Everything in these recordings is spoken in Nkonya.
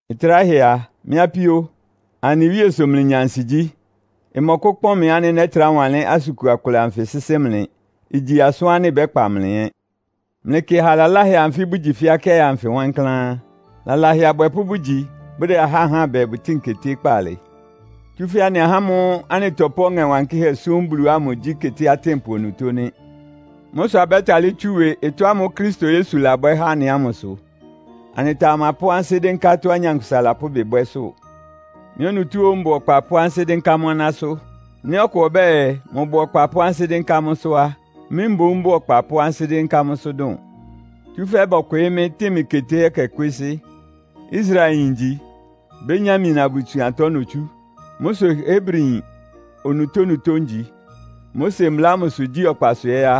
Ɩtráhɛ a, mɩ́ apíó, anɩ Wíe sʋ mlɩnya ansigyí. Ɩmɔkʋ́kpɔn mɩ ánɩ́ nɛ́trá wanlɩ́n asʋn kua kʋlɛ anfɩ sɩ́sɩ́ mlɩ. Igyi asʋ́n ánɩ́ ɩbɛ́kpa mlɩ ɛ́. Mlɩkɩ aha laláhɛ anfɩ́ bʋgyi fɛ́ akɩ́aɩ anfɩ wankláán. Lalahɛ abwɛpʋ́ bʋgyi, bʋdɛ ahá háan bɛɛ bʋtɩ́ɩn keté kpaalɩ. Tsúfɛ́ anɩ ahá ámʋ́ʋ́ anɩtɔpʋ́ Ɔŋɛ Wankɩ́hɛ́ súm Bulu ámʋ gyí keté atɩ́npʋ onutó nɩ́. Mʋ́ sʋ abɛ́talɩ́ tsú ɩwɩ ɩtɔ́ ámʋ́ʋ́ Kristo Yesu labwɛ́ há anɩ ámʋ sʋ. Anɩtamapʋ́ ansɩ́ dɩ́nká tɔ́á nyankpʋsa lapʋ́ ɩbɩ bwɛ́sʋ́. Mɩ́ onutó óó mbʋ ɔkpa pʋ́ ansɩ́ dɩ́nká mʋ́ anásʋ́. Nɩ́ ɔkʋ ɔbɛ́ɛ, mʋbʋ ɔkpa pʋ́ ansɩ́ dɩ́nká mʋ́sʋ́ á, mɩ́ mboún bʋ́ʋ ɔkpa pʋ́ ansɩ́ dɩ́nká mʋ́sʋ́ dʋn. Tsúfɛ́ bɔkwɩɩ́ mɩ́, tɩn mɩ keté ɛkɛ kwésɩ́. Israelyin ngyi. Benyamin abusuantɔ notsú. Mʋ́ sʋ Hebriyin onutónutó ngyi. Mose mbla ámʋsʋ gyí ɔkpasʋ ɛ́ á,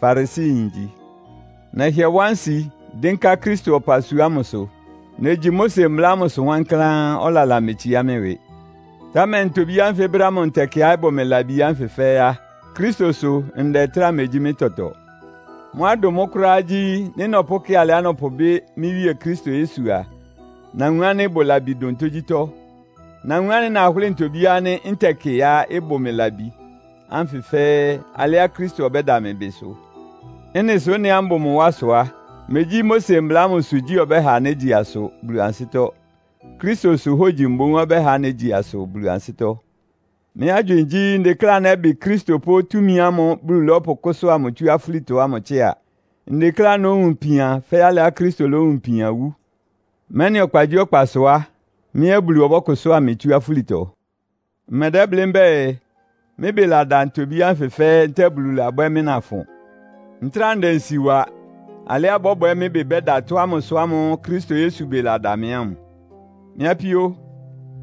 Farisiyin ngyi. Nɛhɩɛ wá nsi, dɩ́nká Kristo ɔpasua ámʋsʋ. Negyi Mose mbla ámʋsʋ wankláán, ɔlala metsiá mɩ́ ɩwɩ. Támɛ ntobí ánfɩ brɛ́ ámʋ ntɛkɩá ɩbʋ mɩ labi ánfɩ fɛ́ɛ́ á, Kristo sʋ ndɛ ɩtráa megyí mɩ́ tɔtɔ. Mʋ́á ɩdʋn mʋ́ kʋ́ráá gyí, nɩ́ nɔpʋ́kɩ alɩá nɔpʋbɩ́ mɩ́ Wíe Kristo Yesu a, nawun ánɩ́ ɩbʋ labi dʋn tógyítɔ́. Nawun ánɩ́ nahʋ́lɩ ntobí ánfɩ ntɛkɩá ɩbʋ mɩ labi ánfɩ fɛ́ɛ́, alɩá Kristo ɔbɛ́da mɩ ɩbɩ sʋ. Ɩ́nɩ sʋ ɩ́nɩá mbʋ mʋ wá sʋ á, megyí Mose mbla ámʋsʋ gyí ɔbɛ́ha négyi asʋ Bulu ansɩ́tɔ́. Kristosʋ hógyi mboún ɔbɛ́ha négyi asʋ Bulu ansɩ́tɔ́. Mɩ́ agywɩɩn gyí, ndekléá nɛ́bɩ Kristo pʋ́ túmi ámʋ́ʋ́ Bulu lɔ́pʋkʋ́sʋ́a mʋ tsú afúlitɔ ámʋ tsɩ́a. Ndekléá nówun ipian fɛ́ alɩá Kristo lówun ipian wú, mɛ́nɩ ɔkpagyíɔkpasʋ á, mɩ́ ɛ́ Bulu ɔbɔ́kʋsʋ́a mɩ tsú afúlitɔ! Mmɛdɛ́blɩ́ mbɛ́ɛ, mɩ́ ɩbɩ lada ntobí ánfɩ fɛ́ɛ́ ntɛ́ɛ Bulu labwɛ́ mɩ́ nafʋn. Ntráa ndɛ nsi wa alɩá ɩbɔ́bwɛ mɩ́ ɩbɩ bɛ́da tɔ́ ámʋ sʋ ámʋ́ʋ́ Kristo Yesu ɩbɩ lada mɩ ámʋ. Mɩ́ apíó,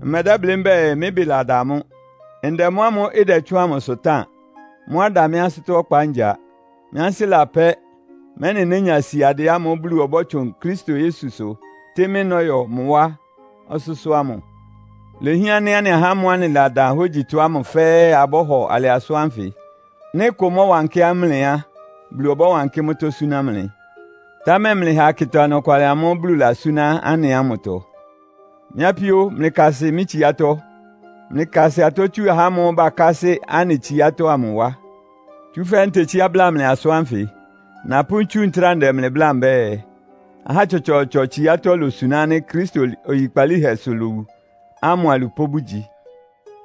mmɛdɛ́blɩ́ mbɛ́ɛ, mɩ́ ɩbɩ lada mʋ́. Ndɛ mʋ́ ámʋ́ʋ́ ɩdɛtsʋ́ʋn amʋsʋ táan. Mʋ́á ɩda mɩ́ ansɩ́tɔ́ ɔkpa ngya. Mɩ́ ansɩ́ lapɛ́, mɛ́nɩ nénya siadɩɛ ámʋ́ʋ́ Bulu ɔbɔ́tsʋn Kristo Yesusʋ tɩ́ mɩ́ nɔ́yɔ mʋ wá ɔsʋ́sʋ́ ámʋ. Ilehián ánɩ́ anɩ ahá ámʋ́ʋ́ anɩladan hógyitɔ ámʋ fɛ́ɛ́ abɔ́hɔ alɩ asʋ́n ánfɩ. Nɩ́ ɩkʋ mɔ́wankɩ́ mlɩ á, Bulu ɔbɔ́wankɩ́ mʋ́tɔ́ súná mlɩ. Támɛ mlɩha akɩta ɔnɔkwalɩ amʋ́ʋ́ Bulu lasúná anɩ ámʋtɔ. Mɩ́ apíó, mlɩkasɩ mɩ́ tsiátɔ́. Mlɩkasɩ atɔ́ tsu ahá ámʋ́ʋ́ bakásɩ́ anɩ tsiátɔ́ ámʋ wá. Tsúfɛ́ ntetsíá bla mlɩ asʋ́n ánfɩ. Napʋ́ ntsú ntráa ndɛ mlɩ bláa mbɛ́ɛ, ahá tsɔtsɔɔtsɔ tsiátɔ́ losuná ánɩ́ Kristo oyikpalíhɛsʋ lowu ámʋ alupʋ́ bʋgyi.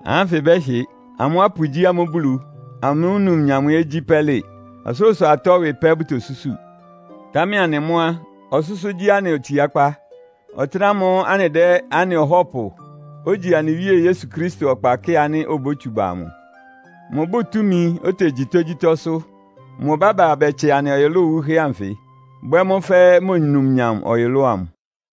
Ahá ánfɩ bɛ́hɩ. Amʋ́ apu gyí amʋ́ Bulu. Amʋ́ numnyam ɛ́ gyí pɛ́lɩ. Ɔsʋlʋ́sʋ atɔ́ ɩwɩ pɛ́ bʋtosúsu. Támɛ anɩ mʋ́ á, ɔsʋ́sʋ́ gyí anɩ otsiákpá. Ɔtɩ́nɛ́ ámʋ́ʋ́ anɩdɛ́ anɩ Ɔhɔ́pʋ, ogyi anɩ Wíe Yesu Kristo ɔkpa kɩ́ɩ ánɩ́ obótsu ba amʋ. Mʋbʋ́ʋ túmi, otegyi tógyítɔ́sʋ́. Mʋ ɔbɛ́ba bɛtsɛ anɩ ɔyʋlʋ́ʋ wuhɛ́ ánfɩ, bwɛ́ mʋ́ fɛ́ mʋ numnyam ɔyʋlʋ́ʋ amʋ.